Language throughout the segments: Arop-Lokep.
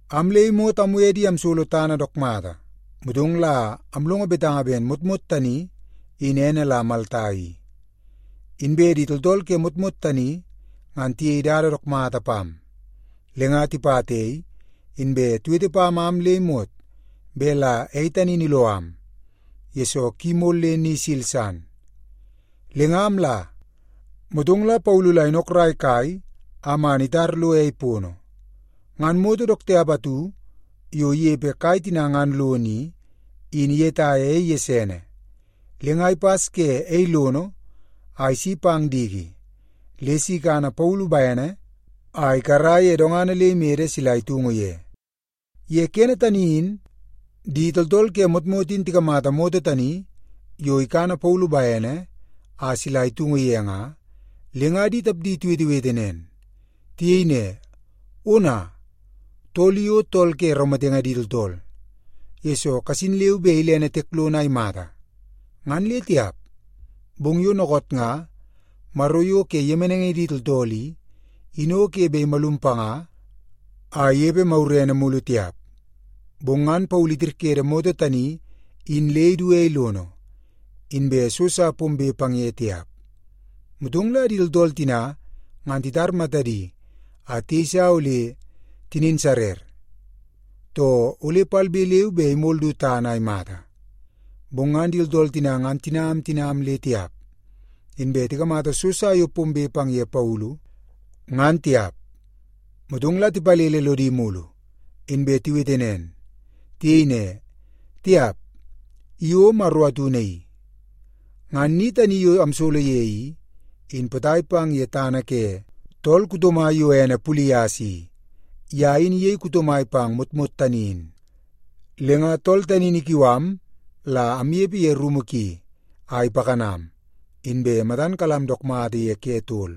Am le imot amwe di amsolo tana dook mata. Motong la amlongo betanga ben motmot tani in ene la Malta i. Inbe di tooltool ke motmot tani ngan tiyei dada dook mata pam. Le nga tipata ei, inbe tiwete pam am le imot bet la ei tani in iloo am, yesoo ki mol le ni isil san. Le nga amla, motong la Paulu la inokrai kai a man itar lo ei pono. Ngan moto dook tiap atu yo inepe kai tina ngan lono i, in iyetaia ei gesene, le nga ipas ke ei lono a isi pang diki le si ikana Paulu bene a ikara ye dongana le imede sila itungu ye. Ye kene tani in di tooltool ke motmot in tikamata moto tani yo ikana Paulu bene a sila itungu ye nga, le nga di tapdi tiwetewete nen. Tiyei ne, “Ona, tool i o tool ke raumatenge di tooltool, yesoo kasin le bet ilene tiek lono a imata, ngan le tiap. Bong yo dookoot nga maro yo ke yemenaingi di tooltool i, in o ke bet imalum panga a inepe magurene mulu tiap.” Bong ngan Paulu itirkede moto tani in le idu ei lono, inbe so sa pombe pang ye tiap. Motong la di tooltool tina ngan titar matadi a tiyeisa ole tinin sarer, too ole palbe leu be imol du tana a imata. Bong ngan di tooltool tina ngan tinam tinam le tiap, inbe tikamata so sa yo pombe pang ye Paulu, ngan tiap. Motong la tipalele lodi mulu, inbe tiwete nen. Tiyei ne, “Tiap, i o maro atu naii.” Ngan ni tani yo amsolo ye i, in potai pang ye tana ke tool kuto mai yo ene Pulias i. Ye in iyei kuto mai pang motmot tani in. Le nga tool tani in ikiu am la amnepe ye rumu ki a ipakanam, inbe matan kalam dook mata ye ke tol.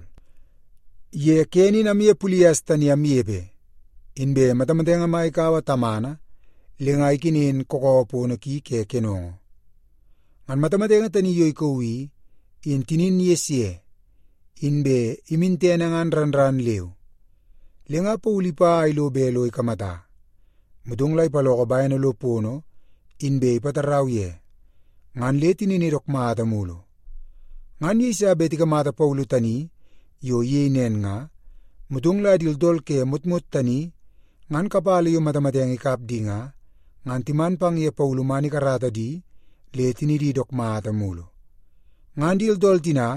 Ye kene in amye Pulias tani amnepe, inbe matamatenge mai ikaua tamana le nga ikenen kakawa pono ki ke kenongo. Ngan matamatenge tani yo ikauu i, in tinin ges ye, inbe imin tene ngan ran ran leu. Le nga Paulu ipa a ilo bet lo ikamata, motong la ipaloko bene lo pono, inbe ipatarau ye, ngan le tinini dook mata mulu. Ngan yeiso bet tikamata Paulu tani yo iyei nen nga, motong la di tooltool ke motmot tani ngan kapala yo matamatenge ikap di nga, ngan timan pang ye Paulu man ikarata di le tinidi dook mata mulu. Ngan di tooltool tina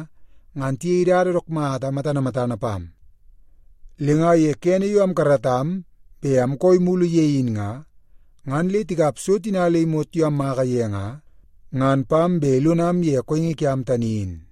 ngan tiyei dada dook mata matana matana pam, le nga ye kene yo amkaratam bet amkooi mulu ye in nga, ngan le tikap so tina le imot yo ammaka ye nga, ngan pam bet ilonam ye kooingi kiam tani in.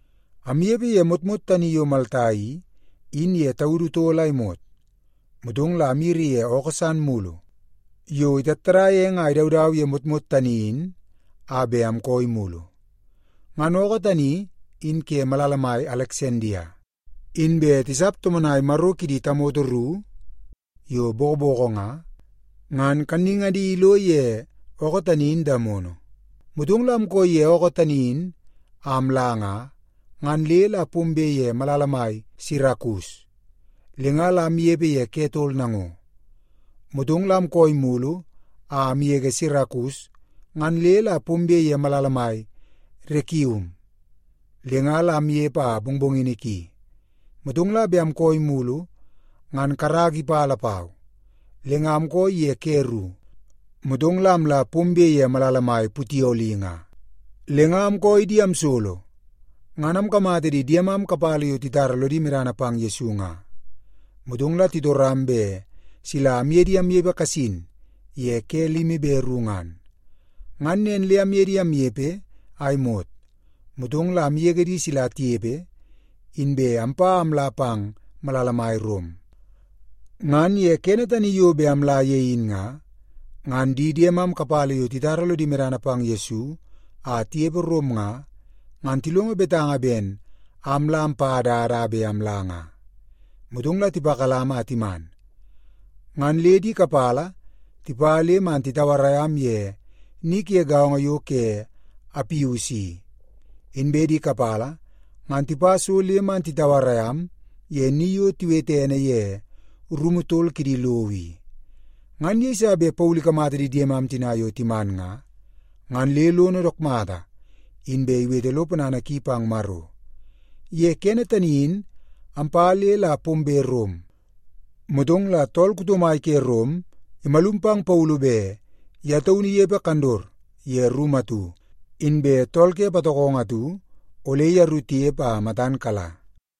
Amnepe ye motmot tani yo Malta i, in ye taudu tol a imot, motong la amyiri ye ookoo san mulu yo itattadaia eng a idaudau ye motmot tani in a bet amkooi mulu. Ngan ookoo tani in ke malala mai Aleksandia, inbe tisap tomonai maro kidi tamoto ru yo bokoboko nga, ngan kannungadi ilo ye ookoo tani in damono. Motong la amkooi ye ookoo tani in a amla nga, ngan le la pombe ye malala mai Sirakus, le nga la amnepe ye ke tol nango. Motong la amkooi mulu a amgege Sirakus, ngan le la pombe ye malala mai Rekium. Le nga la amnepe a mongmongini ki, motong la bet amkooi mulu ngan karaka ipa lapau, le nga amkooi ye ke ru, motong la amla pombe ye malala mai Putioli nga. Le nga amkooi di amsolo, ngan amkamata di diemam kapala yo titara lodi medana pang Yesu nga. Motong la titoram bet sila amye di amnepe kasin ye ke limi be ru ngan. Ngan nen le amye di amnepe a imot, motong la amgege di sila tinepe, inbe ampa a amla pang malala mai Rom. Ngan ye kene tani yo bet amla ye in nga, ngan di diemam kapala yo titara lodi medana pang Yesu a tinepe Rom nga, ngan tilongo betanga ben am la ampa dada a bet amla nga. Motong la tipakalam a timan, ngan le di kapala tipa le man titauarai am ye ni ke gaongo yo ke Apius i, inbe di kapala ngan tipa so le man titauarai am ye ni yo tiwete ene ye Rumu Tol Kidi Lowo i. Ngan yeiso bet Paulu ikamata di diemam tina yo timan nga, ngan le lono dook mata, inbe iwete lo ponana ki pang Maro. Ye kene tani in ampa le la pombe Rom, motong la tool kuto mai ke Rom imalum pang Paulu bet ye taunu inepe kandot ye rumu atu, inbe tool ke patokongo atu ole yeru tinepe a matan kala.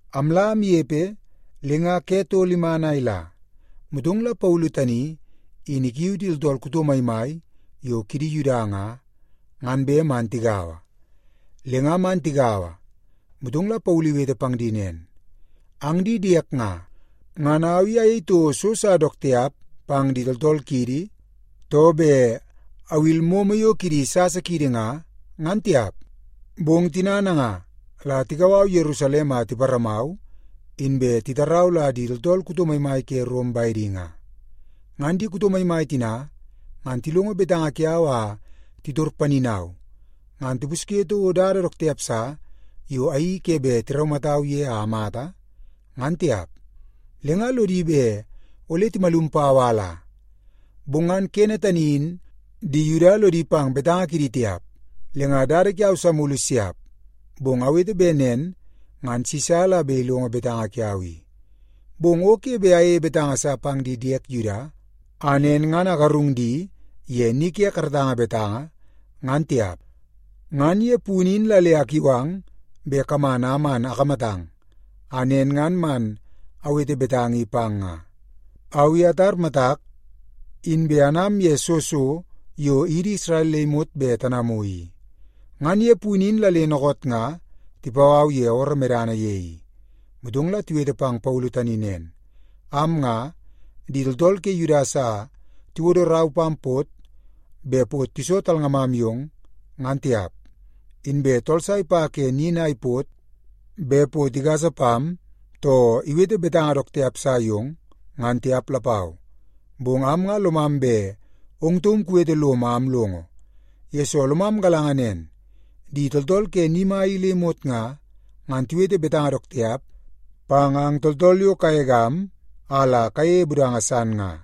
Amla amnepe, le nga ke tol iman a ila, motong Paulu tani in ikiu di tooltool kuto maimai yo kidi Yuda nga, ngan bet man tigaua. Le nga man tigaua, motong la Paulu iwete pang di nen, “Ang di diek nga, ngan au i ayei toko so sa dook tiap pang di tooltool kiidi, too bet awil momo yo kidi sasa kiidi nga, ngan tiap. Bong tina nanga la tikau au Yerusalem a tiparamau, inbe titarau la di tooltool kuto maimai ke Rom bedi nga. Ngan di kuto maimai tina ngan tilongo betanga kiau a titor paninau, ngan tipusye toko dada dook tiap sa yo ayeii ke bet tiraumatau ye a amata, ngan tiap. Le nga lodi bet ole timalum pau a ala. Bong ngan kene tani in di Yuda lodi pang betanga kidi tiap. Le nga dada kiau sa mulu siap, bong awete bet nen ngan Sisa la bet ilongo betanga kiau i. Bong o ke bet ayeie betanga sa pang di diek Yuda, a nen ngan agarung di ye ni ke karatanga betanga, ngan tiap. Ngan ye punu in la le akiu ang bet kaman a man akamatang, a nen ngan man awete betanga i pang nga. Au i atar matak, inbe anam ye soo so yo idi Isrel le imot bet tanamu i, ngan ye punu in la le dookoot nga tipau au ye ooroo medana ye i.” Motong la tiwete pang Paulu tani nen, “Am nga, di tooltool ke Yudia sa tiwodo rau pam pot bet pot iso talngamam yong, ngan tiap. Inbe tooltool sa ipa ke nin a ipot bet pot igasa pam, too iwete betanga dook tiap sa yong, ngan tiap lapau. Bong am nga lomam bet ong taum kuwete lom a amlongo, yesoo lomam galanga nen di tooltool ke ni mai i le imot nga, ngan tiwete betanga dook tiap pang ang tooltool yo kagegam a la kayeie budanga san nga.”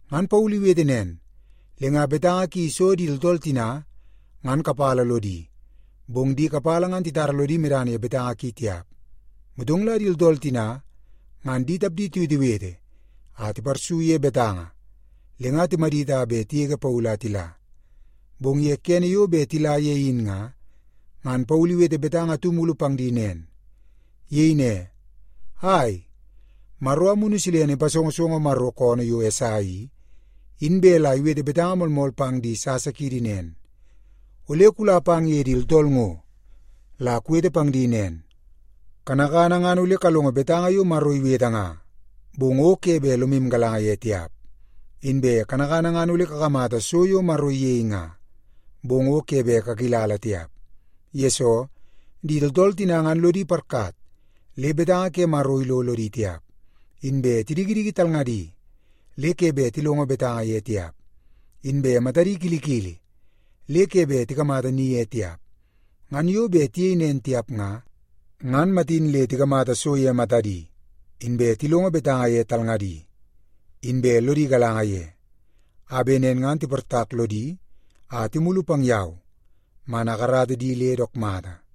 Ngan Paulu iwete nen, le nga betanga ki iso di tooltool tina ngan kapala lodi, bong di kapala ngan titara lodi medana ye betanga ki tiap. Motong la di tooltool tina ngan di tapdi tiwetewete a tiparsu ye betanga, le nga timadit a bet tigege Paulu a tila. Bong ye kene yo bet tila ye in nga, ngan Paulu iwete betanga atu mulu pang di nen. Iyei ne, “Ai, Maro Amunu Silene ipasongosongo Maro koonoo yo Esai i, in bet la iwete betanga moolmool pang di sasa kiidi nen, ‘Ole kula pang ye di tooltool ngo la kuwete pang di nen, “Kanakana ngan ole kalongo betanga yo Maro iwete nga, bong o ke bet lomu galanga ye tiap. Inbe kanakana ngan ole kakamata so yo Maro iyei nga, bong o ke bet kakilala tiap.” Yesoo, di tooltool tina ngan lodi parkat le betanga ke Maro ilo lodi tiap, inbe tidikidiki talngadi le ke bet tilongo betanga ye tiap, inbe matadi kilikili le ke bet tikamata ni ye tiap. Ngan yo bet tiyei nen tiap nga, ngan matin nga le tikamata so ye matadi, inbe tilongo betanga ye talngadi, inbe lodi galanga ye, a bet nen ngan tiportak lodi a timulu pang yau man akarata di le dook mata.’”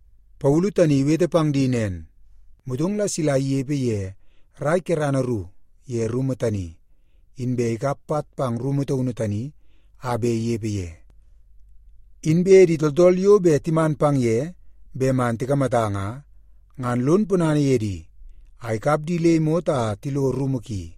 Paulu tani iwete pang di nen, motong la sila inepe ye rai kerana ru ye rumu tani. Inbe ikap pat pang rumu taunu tani a bet inepe ye. Inbe di tooltool yo bet timan pang ye bet man tikamata nga, ngan lon ponana ye di a ikap di le imot a tilo rumu ki.